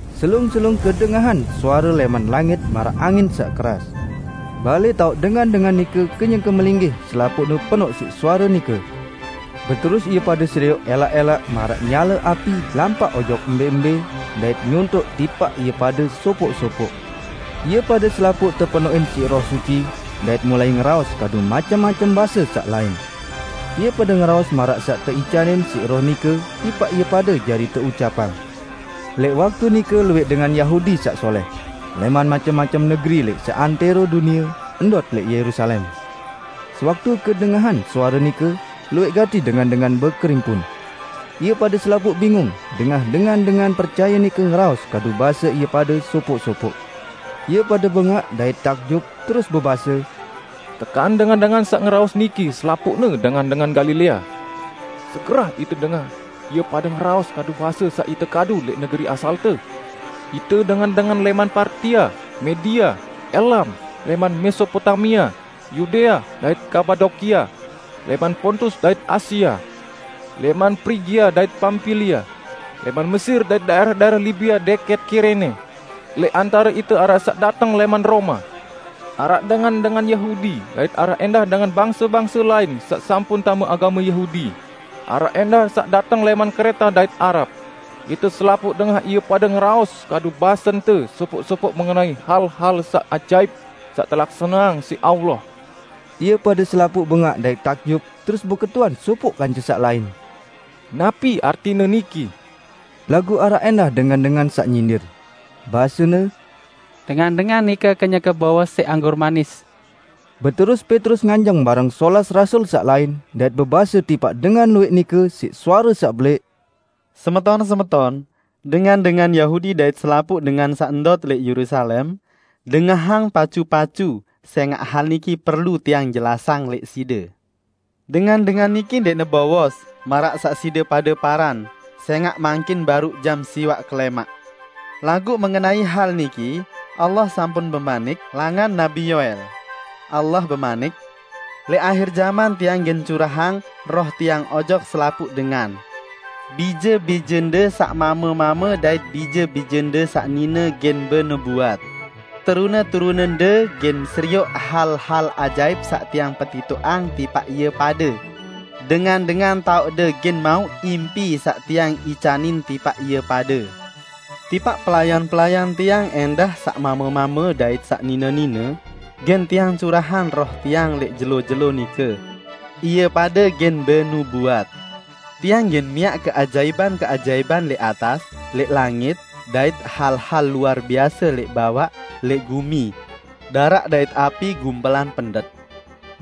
Selung-selung kedengahan suare lẽman langit maraq angin saq keras. Balẽ taoq dengan-dengan nike kenyeke melinggih selapuqne penoq siq suare nike. Beterus ie pade serioq ẽlaq-ẽlaq maraq nyale api lampaq ojok embẽ-embẽ, dait nyontoq tipaq ie pade sopoq-sopoq. Ie pade selapuq tepenoqin siq Roh Suci, dait mulai ngeraos kadu macem-macem base saq lain. Ie pade ngeraos maraq saq teicanin siq Roh nike tipaq ie pade jari teucapang. Lẽq waktu nike luwẽq dengan Yahudi saq solẽh, lẽman macem-macem negeri lẽq seantẽro dunie, ndot lẽq Yerusalem. Sewaktu kedengahan suare nike, luwẽq gati dengan-dengan bekerimpun. Ie pade selapuq bingung dengah dengan-dengan percaye nike ngeraos kadu base ie pade sopoq-sopoq. Ie pade bengaq dait takjub terus bebase, "Tekan dengan-dengan saq ngeraos niki selapuqne dengan-dengan Galilea? Segerah ite dengah ie pade ngeraos kadu base saq ite kadu lẽq negeri asalte? Ite dengan-dengan lẽman Partia, Media, Elam, lẽman Mesopotamia, Yudea dait Kapadokia; lẽman Pontus dait Asia, lẽman Prigia dait Pampilia, lẽman Mesir dait daẽrah-daẽrah Libia dẽkẽt Kirene; lẽq antare ite araq saq dateng lẽman Roma, araq dengan-dengan Yahudi dait araq ẽndah dengan bangse-bangse lain saq sampun tame agame Yahudi; araq ẽndah saq dateng lẽman Kreta dait Arab. Ite selapuq dengah ie pade ngeraos kadu basente sopoq-sopoq mengenai hal-hal saq ajaip saq telaksaneang siq Allah!" Ie pade selapuq bengaq dait takjub terus beketuan sopoq kance saq lain, "Napi artine niki?" Laguq araq ẽndah dengan-dengan saq nyindir. Basene, "Dengan-dengan nike kenyeke bowos siq anggur manis!" Beterus Petrus nganjeng bareng solas rasul saq lain, dait bebase tipaq dengan luwẽq nike siq suare saq belẽq, "Semeton-semeton, dengan-dengan Yahudi dait selapuq dengan saq ndot lẽq Yerusalem! Dengahang pacu-pacu, sẽngaq hal niki perlu tiang jelasang lẽq side. Dengan-dengan niki ndẽqne bowos, maraq saq side pade paran; sẽngaq mangkin baruq jam siwaq kelẽmaq. Laguq mengenai hal niki Allah sampun bemanik langan Nabi Yoel: Allah bemanik, 'Lẽq ahir jaman Tiang gen curahang Roh Tiang ojok selapuq dengan. Bije-bijende saq mame-mame dait bije-bijende saq nine gen benubuat. Terune-terunende gen serioq hal-hal ajaip saq Tiang petitoqang tipaq ie pade. Dengan-dengan toaqde gen mauq impi saq Tiang icanin tipaq ie pade. Tipaq pelayan-pelayan Tiang ẽndah -- saq mame-mame dait saq nine-nine --, gen Tiang curahang Roh Tiang lẽq jelo-jelo nike. Ie pade gen benubuat. Tiang gen miaq keajaipan-keajaipan lẽq atas, lẽq langit, dait hal-hal luar biase lẽq bawaq, lẽq gumi; daraq dait api, gumpelan pendet.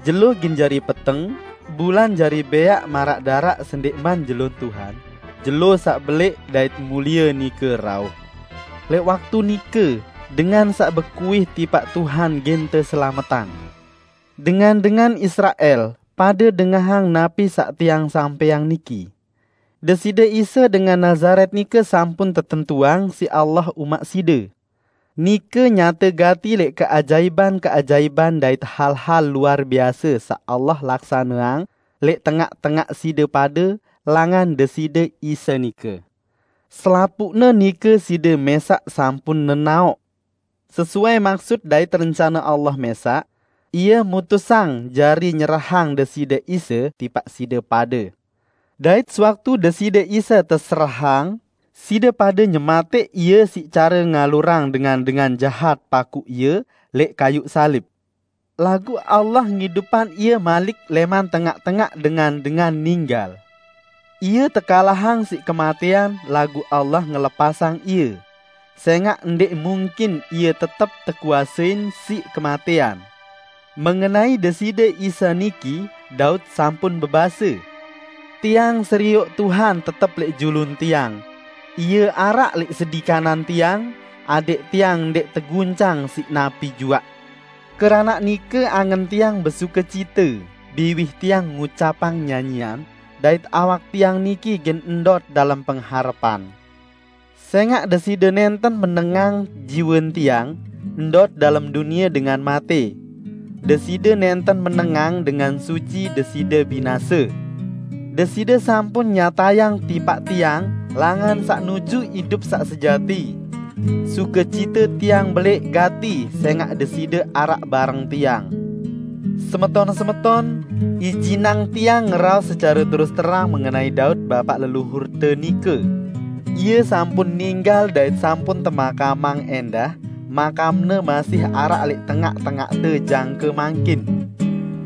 Jelo gen jari peteng, bulan jari bẽaq maraq daraq sendẽqman Jelo Tuhan, jelo saq belẽq dait mulie nike rauh. Lẽq waktu nike, dengan saq bekuih tipaq Tuhan gen teselametang.' Dengan-dengan Israel! Pade dengahang napi saq tiang sampẽang niki: Deside Isa dengan Nazaret nike sampun tetentuang siq Allah umaq side. Nike nyate gati lẽq keajaipan-keajaipan dait hal-hal luar biase saq Allah laksaneang lẽq tengaq-tengaq side pade langan Deside Isa nike. Selapuqne nike side mẽsaq sampun nenaoq. Sesuai maksut dait rencane Allah mẽsaq, Ie mutusang jari nyerahang Deside Isa tipaq side pade. Dait sewaktu Deside Isa teserahang, side pade nyematẽq Ie siq care ngalurang dengan-dengan jahat pakuq Ie lẽq kayuq salib. Laguq Allah ngidupang Ie malik lẽman tengaq-tengaq dengan-dengan ninggal. Ie tekalahang siq kematẽan, laguq Allah ngelepasang Ie, sẽngaq ndẽq mungkin Ie tetep tekuasein siq kematẽan. Mengenai Deside Isa niki, Daud sampun bebase, 'Tiang serioq Tuhan tetep lẽq julun tiang; Ie araq lẽq sedi kanan tiang, adẽq tiang ndẽq teguncang siq napi juaq. Keranaq nike angen tiang besukecita, biwih tiang ngucapang nyanyian; dait awak tiang niki gen ndot dalem pengharepan. Sẽngaq Deside nẽnten menengang jiwen tiang ndot dalem dunie dengan matẽ. Deside nẽnten menengang Dengan Suci Deside binase. Deside sampun nyatayang tipaq tiang langan saq nuju idup saq sejati. Sukecite tiang belẽq gati, sẽngaq Deside araq bareng tiang.' Semeton-semeton, ijinang tiang ngeraos secare terus terang mengenai Daud, bapaq leluhurte nike. Ie sampun ninggal dait sampun temakamang ẽndah; makamne masih araq lẽq tengaq-tengaqte jangke mangkin.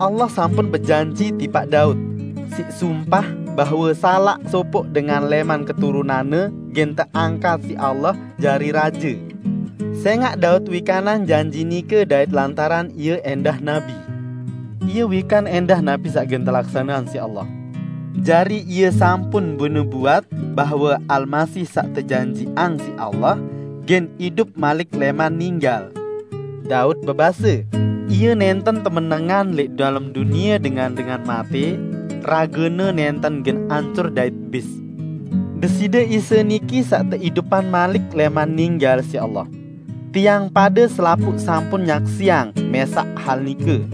Allah sampun bejanji tipaq Daud, siq sumpah, bahwe salaq sopoq dengan lẽman keturunanne gen teangkat siq Allah jari raje. Sẽngaq Daud wikanang janji nike dait lantaran ie ẽndah nabi, ie wikan ẽndah napi saq gen telaksaneang siq Allah. Jari ie sampun benubuat bahwe Almasih saq tejanjiqang siq Allah, gen idup malik lẽman ninggal. Daud bebase, 'Ie nẽnten temenengang lẽq dalem dunie dengan-dengan matẽ; rage-Ne nẽnten gen ancur dait bis.' Deside Isa niki saq teidupang malik lẽman ninggal siq Allah. Tiang pade selapuq sampun nyaksiang mẽsaq hal nike.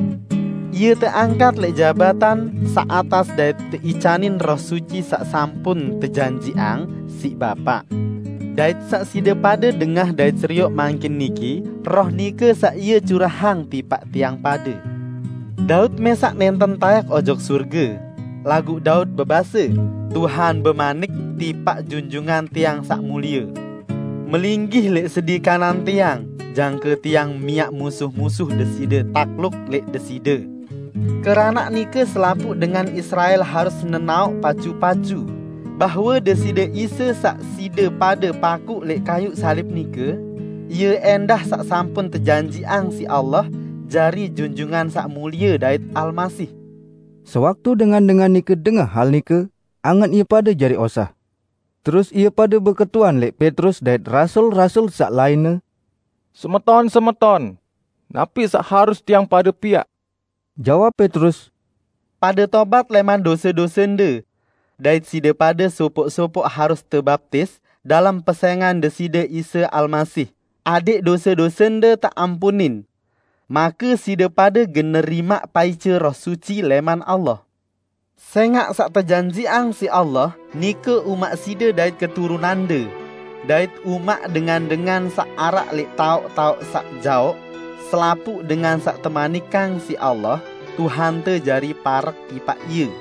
Ie teangkat lẽq jabatan saq atas dait teicanin Roh Suci saq sampun tejanjiqang siq Bapa. Dait saq side pade dengah dait serioq mangkin niki, Roh nike saq Ie curahang tipaq tiang pade. Daud mẽsaq nẽnten taẽk ojok sorge, laguq Daud bebase, 'Tuhan bemanik tipaq Junjungan tiang Saq Mulie: Melinggih lẽq sedi kanan Tiang, jangke Tiang miaq musuh-musuh Deside takluk lẽq Deside!' Keranaq nike selapuq dengan Israel harus nenaoq pacu-pacu bahwe Deside Isa saq side pade pakuq lẽq kayuq salib nike, Ie ẽndah saq sampun tejanjiqang siq Allah jari Junjungan Saq Mulie dait Almasih!" Sewaktu dengan-dengan nike dengah hal nike, angen ie pade jari osah. Terus ie pade beketuan lẽq Petrus dait rasul-rasul saq lainne, "Semeton-semeton, napi saq harus tiang pade piaq?" Jawab Petrus, "Pade tobat lẽman dose-dosende. Dait side pade sopoq-sopoq harus tebaptis dalem pesẽngan Deside Isa Almasih, adẽq dose-dosende teampunin. Make side pade gen nerimaq paice Roh Suci lẽman Allah. Sẽngaq saq tejanjiqang siq Allah, nike umaq side dait keturunande, dait umaq dengan-dengan saq araq lẽq taoq-taoq saq jaoq -- selapuq dengan saq temanikang siq Allah, Tuhante jari parek tipaq Ie."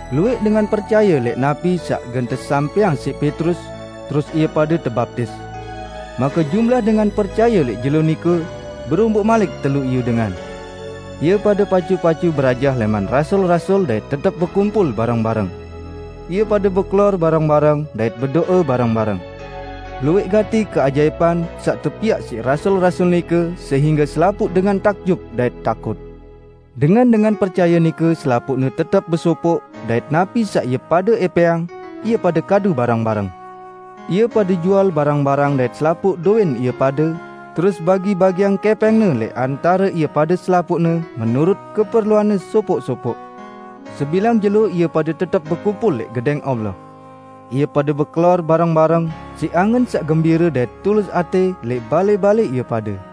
Luwẽq dengan percaye lẽq napi saq gen tesampẽang siq Petrus, terus ie pade tebaptis. Make jumlah dengan percaye lẽq jelo nike beromboq malik telu iyu dengan. Ie pade pacu-pacu berajah lẽman rasul-rasul dait tetep bekumpul bareng-bareng. Ie pade bekelor bareng-bareng dait bedo'e bareng-bareng. Luwẽq gati keajaipan saq tepiaq siq rasul-rasul nike sehingge selapuq dengan takjub dait takut. Dengan-dengan percaye nike selapuqne tetep besopoq dait napi saq ie pade ẽpẽang, ie pade kadu bareng-bareng. Ie pade jual barang-barang dait selapuq dowẽn ie pade, terus bagi-bagiang kẽpẽngne lẽq antare ie pade selapuqne menurut keperluanne sopoq-sopoq. Sebilang jelo ie pade tetep bekumpul lẽq Gedẽng Allah. Ie pade bekelor bareng-bareng, siq angen saq gembire dait tulus atẽ lẽq balẽ-balẽ ie pade.